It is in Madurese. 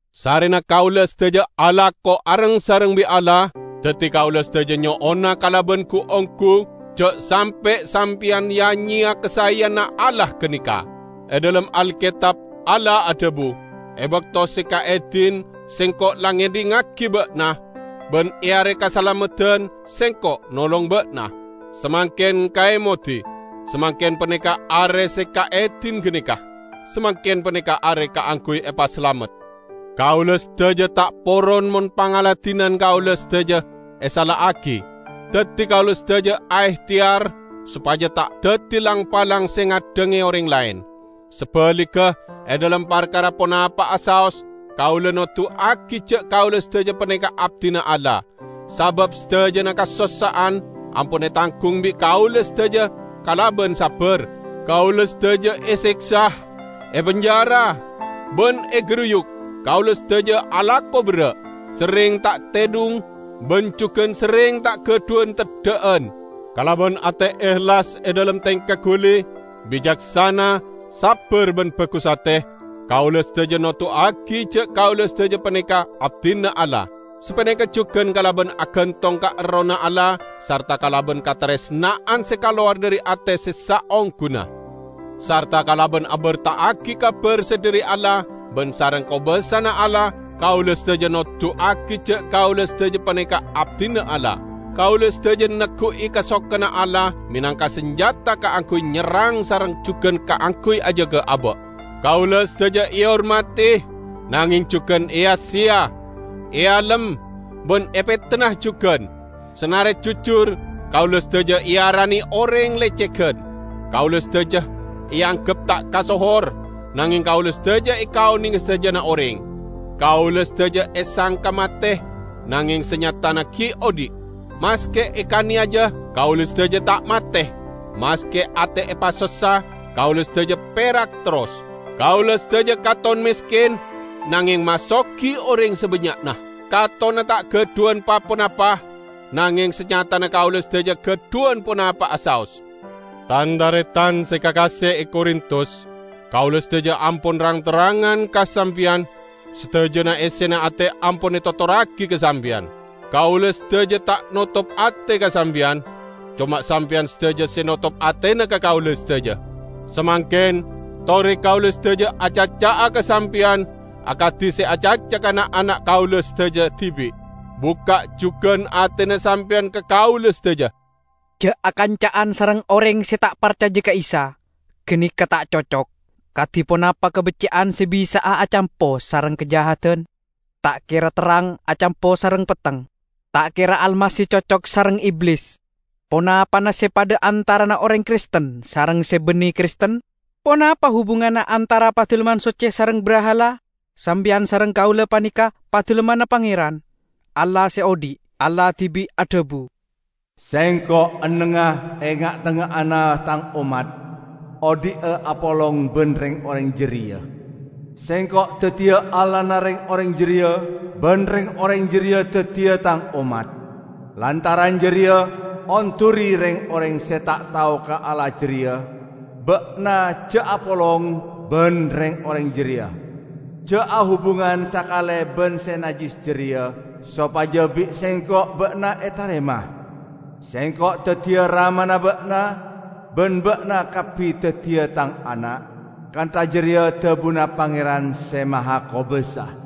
Sarrena kaula sadaja alako areng-sareng bi' Allah, daddi kaula sadaja nyo'ona kalaban gu-onggu ja' sampe' sampeyan ya-nyeya kasaeyanna Allah ganeka. E dhalem Alketab Allah adhabu, "E bakto se kaedin, Sengko' la ngedhingngagi ba'na, ban e are kasalameddan, Sengko' nolong ba'na." Samangken kaemodi! Samangken paneka are se kaedin ganeka! Samangken paneka are kaangguy epasalamet! Kaula sadaja ta' poron mon pangladinan kaula sadaja esala'agi. Daddi kaula sadaja aehteyar sopaja ta' daddi lang-palang se ngaddhange oreng laen. Sabaligga, e dhalem parkara ponapa'a saos, kaula noduwagi ja' kaula sadaja paneka abdina Allah. Sabab sadajana kasossa'an ampon etanggung bi' kaula sadaja kalaban sabbar: kaula sadaja eseksa, epenjara ban egaruyu'; kaula sadaja alako berra', serreng ta' tedhung ban jugan serreng ta' gadhuwan teddha'an. Kalaban ate ehlas e dhalem tengka guli, bicaksana, sabbar ban bagus ate, kaula sadaja noduwagi ja' kaula sadaja paneka abdina Allah. Sapaneka jugan kalaban agantong ka Errohna Allah, sarta kalaban kataresna'an se kalowar dhari ate se saongguna, sarta kalaban aberta'agi kabar se dhari Allah ban sareng kobasana Allah, kaula sadaja noduwagi ja' kaula sadaja paneka abdina Allah. Kaula sadaja neggu'i kasokanna Allah menangka sanjata kaangguy nyerrang sareng jugan kaangguy ajaga aba'. Kaula sadaja ehormadi, nangeng jugan eya-seya; ealem, ban epetenna jugan. Sanare jujur, kaula sadaja earane oreng lecegan. Kaula sadaja eanggep ta' kasohor, nangeng kaula sadaja ekaonenge sadajana oreng. Kaula sadaja esangka mate, nangeng sanyatana gi' odhi'. Maske ekaneyaja, kaula sadaja ta' mate. Maske ate epasossa, kaula sadaja perak terros. Kaula sadaja katon mesken, nangeng masogi oreng sabannya'na. Katonna ta' gadhuwan pa-ponapa, nangeng sanyatana kaula sadaja gadhuwan ponapa'a saos. Tan-taretan se kakase e Korintus! Kaula sadaja ampon rang-terrangan ka sampeyan; sadajana essena ate ampon etotorragi ka sampeyan. Kaula sadaja ta' notop ate ka sampeyan, coma sampeyan sadaja se notop atena ka kaula sadaja. Samangken, tore kaula sadaja acaca'a ka sampeyan akadi se acaca ka na'-ana' kaula sadaja dibi'. Bukka' jugan atena sampeyan ka kaula sadaja. Ja' akanca'an sareng oreng se ta' parcaja ka Isa; ganeka ta' cocok. Kadi ponapa kabecce'an se bisa'a acampo sareng kajahadan! Ta' kera terrang acampo sareng petteng. Ta' kera Almasih cocok sareng Iblis. Ponapana se padha antarana oreng Kristen sareng se banne Kristen? Ponapa hubunganna antara Padalemman Socce sareng brahala? Sampeyan sareng kaula paneka Padalemmanna Pangeran, Allah se odhi'. Allah dibi' adhabu, "Sengko' ennengnga e nga'-tengnga'anna Tang ommat, odhi'a apolong ban reng-oreng jareya. Sengko' daddiya Allahna reng-oreng jareya, ban reng-oreng jareya daddiya Tang ommat. Lantaran jareya, onduri reng-oreng se ta' tao ka Allah jareya, ba'na ja' apolong ban reng-oreng jareya. Ja' ahubungan sakale ban se najjis jareya, sopaja bi' Sengko' ba'na etarema. Sengko' daddiya Ramana ba'na, ban ba'na kabbi daddiya Tang ana', kantha jareya dhabuna Pangeran Se Mahakobasa."